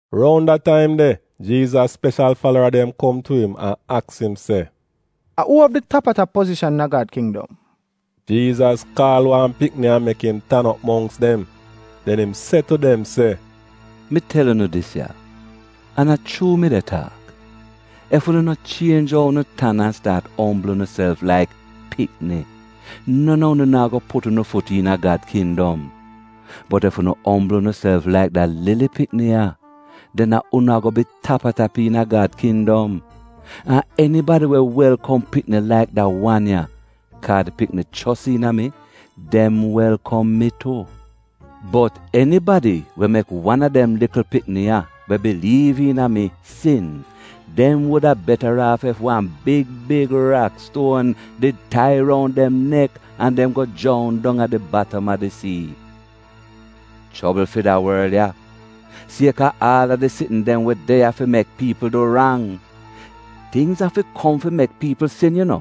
Roun da taim de Jiizas speshal falara dem kom tu im an aks im se, “A uu av di tap-a-tap pozishan iina Gad Kindom?” Jiizas kaal wan pikni an mek im tan op mongks dem. Den im se tu dem se, “Mi tel unu dis ya, an a chuu mi de taak, ef unu no chienj ou unu tan an staat ombl unuself laik pikni, non a unu naa go put unu fut iina Gad kindom. Bot ef unu ombl unuself laik da lili pikni ya, den a unu ago bi tap-a-tap iina Gad kindom. “An enibadi we welkom pikni laik da wan ya, kaa di pikni chos iina mi, dem welkom mi tu. Bot enibadi we mek wan a dem likl pikni ya, we biliiv iina mi, sin, dem wuda betaraaf ef wan big big rakstuon did tai roun dem nek an dem go joun dong a di batam a di sii. “Chobl fi da worl ya, sieka aal a di sitn dem we de ya fi mek piipl du rang! Tingz afi kom fi mek piipl sin yu no,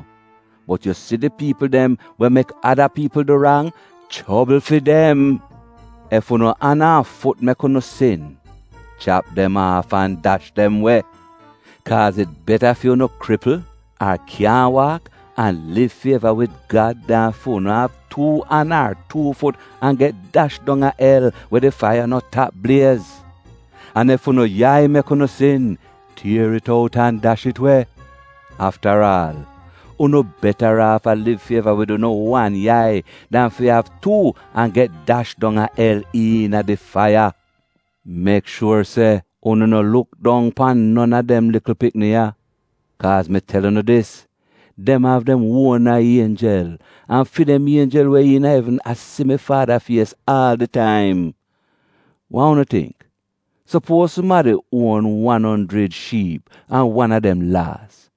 bot yu si di piipl dem we mek ada piipl du rang, chobl fi dem! Ef unu an an fut mek unu sin, chap dem aaf an dash dem we. Kaaz it beta fi unu kripl ar kyaahn waak an liv fi eva wid Gad dan fu'unu av tuu an ar tuu fut an get dash dong a el we di faiya no tap bliez. An ef unu yai mek unu sin, tier it out an dash it we. Aftaraal, unu betaraaf a liv fi eva wid unu wan yai, dan fi av tuu, an get dash dong a el iina di faiya. “Mek shuor se unu no luk dong pan non a dem likl pikni ya. Kaaz mi tel unu dis, dem av dem uona ienjel, an fi dem ienjel we iina evn a si mi Faada fies aal di taim. “Wa unu tingk? Supuoz sumadi uon wan onjrid shiip an wan a dem laas.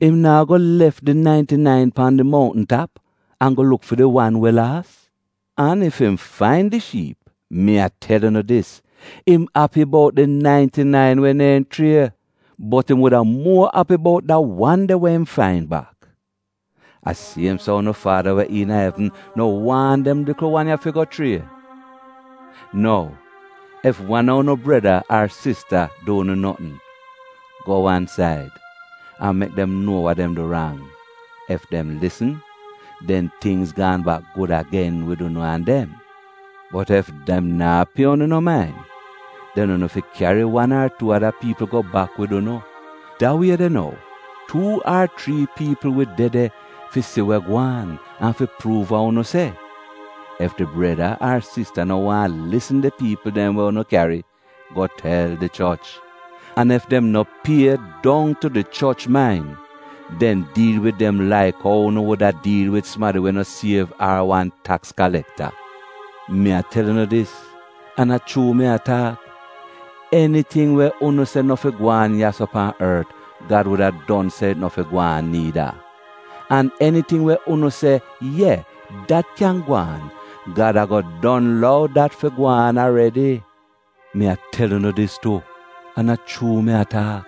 Im naa go lef di nainti-nain pan di mountn tap an go luk fi di wan we laas? An ef im fain di shiip, mi a tel unu dis, im api bout di nainti-nain we neehn schrie, bot im wuda muo api bout da wan de we im fain bak. A siem so unu Faada we iina evn no waahn dem likl wan ya fi go schrie. “Nou, ef wan a unu breda ar sista du unu notn, go wan said, an mek dem nuo wa dem du rang. Ef dem lisn, den tingz gaan bak gud agen wid unu an dem. Bot ef dem naa pie unu no main, den unu fi kyari wan ar tuu ada piipl go bak wid unu. Da wie de nou, tuu ar chrii piipl wi de de fi si we gwaan an fi pruuv wa unu se. Ef di breda ar sista no waahn lisn di piipl dem we unu kyari, go tel di choch. An ef dem no pie dong tu di choch main, den diil wid dem laik ou unu wuda diil wid sumadi we no siev ar wan taks kalekta. “Mi a tel unu dis, an a chuu mi a taak, eniting we unu se no fi gwaan ya-so pan ort, Gad wuda don se it no fi gwaan niida. An eniting we unu se: ye, dat kyan gwaan, Gad ago don lou dat fi gwaan aredi. “Mi a tel unu dis tu an a chuu mi a taak,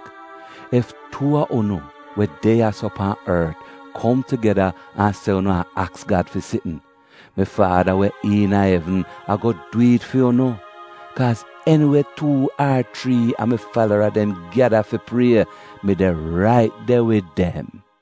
ef tuu a unu we de ya-so pan ort kom tugeda an se unu a aks Gad fi sitn, mi Faada we iina evn ago dwi'it fu'unu. Kaaz eniwe tuu ar chrii a mi falara dem gyada fi prie, mi de rait de wid dem.”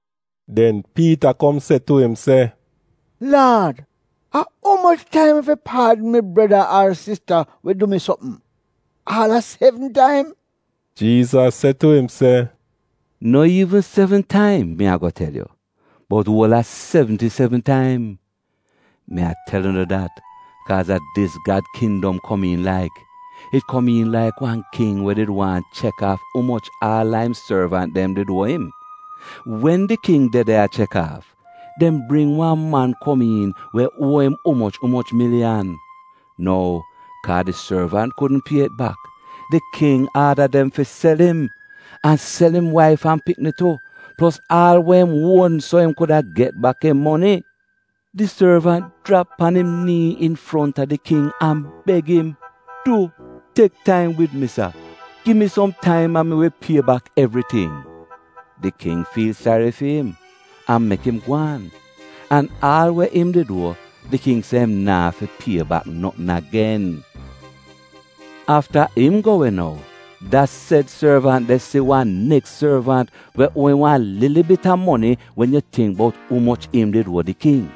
Den Piita kom se tu im se, “Laad a umoch taim mi fi paadn mi breda ar sista we du mi sopm? Aal a sevn taim?” Jiizas se tu im se, “No iivn sevn taim mi ago tel yu, bot uol a sevnti sevn taim! “Mi a tel unu dat, kaaz a dis Gad kindom komiin laik: it komiin laik wan king we did waahn chek aaf umoch aal a im sorvant dem did uo im. Wen di king de de a chek aaf, dem bring wan man kom we uo im umoch umoch miliyan. Nou, kaa di sorvant kudn pie it bak, di king gi aadaz fi dem sel im, an sel im waif an pikni tu, plos aal we im uon so im kuda get bak im moni. “Di sorvant jrap pan im nii infronta di king an beg im, ‘Du tek taim wid mi sa, gi mi som taim an mi wi pie bak evriting.’ Di king fiil sari fi im an mek im gwaan. An aal we im did uo, di king se im naa fi pie bak notn agen. “Afta im go we nou, da sed sorvant de si wan neks sorvant we uo im wan lili bit a moni wen yu tingk bout umoch im did uo di king.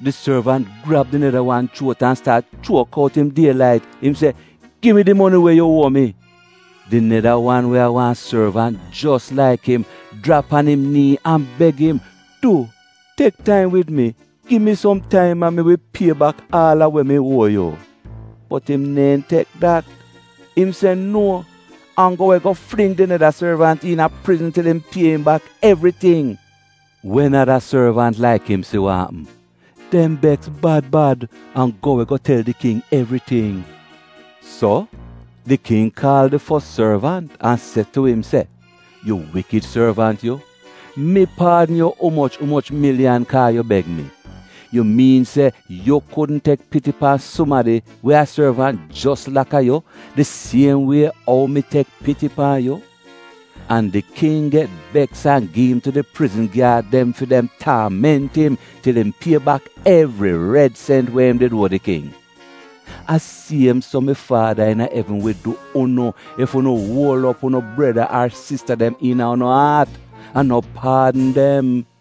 Di sorvant grab di neda wan chuot an staat chuok out im die lait. Im se, ‘Gi mi di moni we yu uo mi!’ “Di neda wan we a wan sorvant jos laik im jrap pan im nii an beg im, ‘Du, tek taim wid mi. Gi mi som taim an mi wi pie bak aal a we mi uo yu.’ “Bot im neehn tek dat. Im se nuo, an go we go fling di neda sorvant iina prizn til im pie im bak evriting. Wen ada sorvant laik im si wa apm, dem beks bad bad an go we go tel di king evriting. “So di king kaal di fos sorvant an se tu im se, ‘Yu wikid sorvant yu! Mi paadn yu umoch umoch miliyan kaa yu beg mi! Yu miin se yu kudn tek piti pan sumadi we a sorvant jos laka yu di siem wie ou mi tek piti pan yu?’ An di king get beks an gi im tu di prizn gyaad dem fi dem taament im til im pie bak evri red sent we im did uo di king. “A siem so mi Faada iina evn wi du unu ef unu uol op unu breda ar sista dem iina unu aat, an no paadn dem.”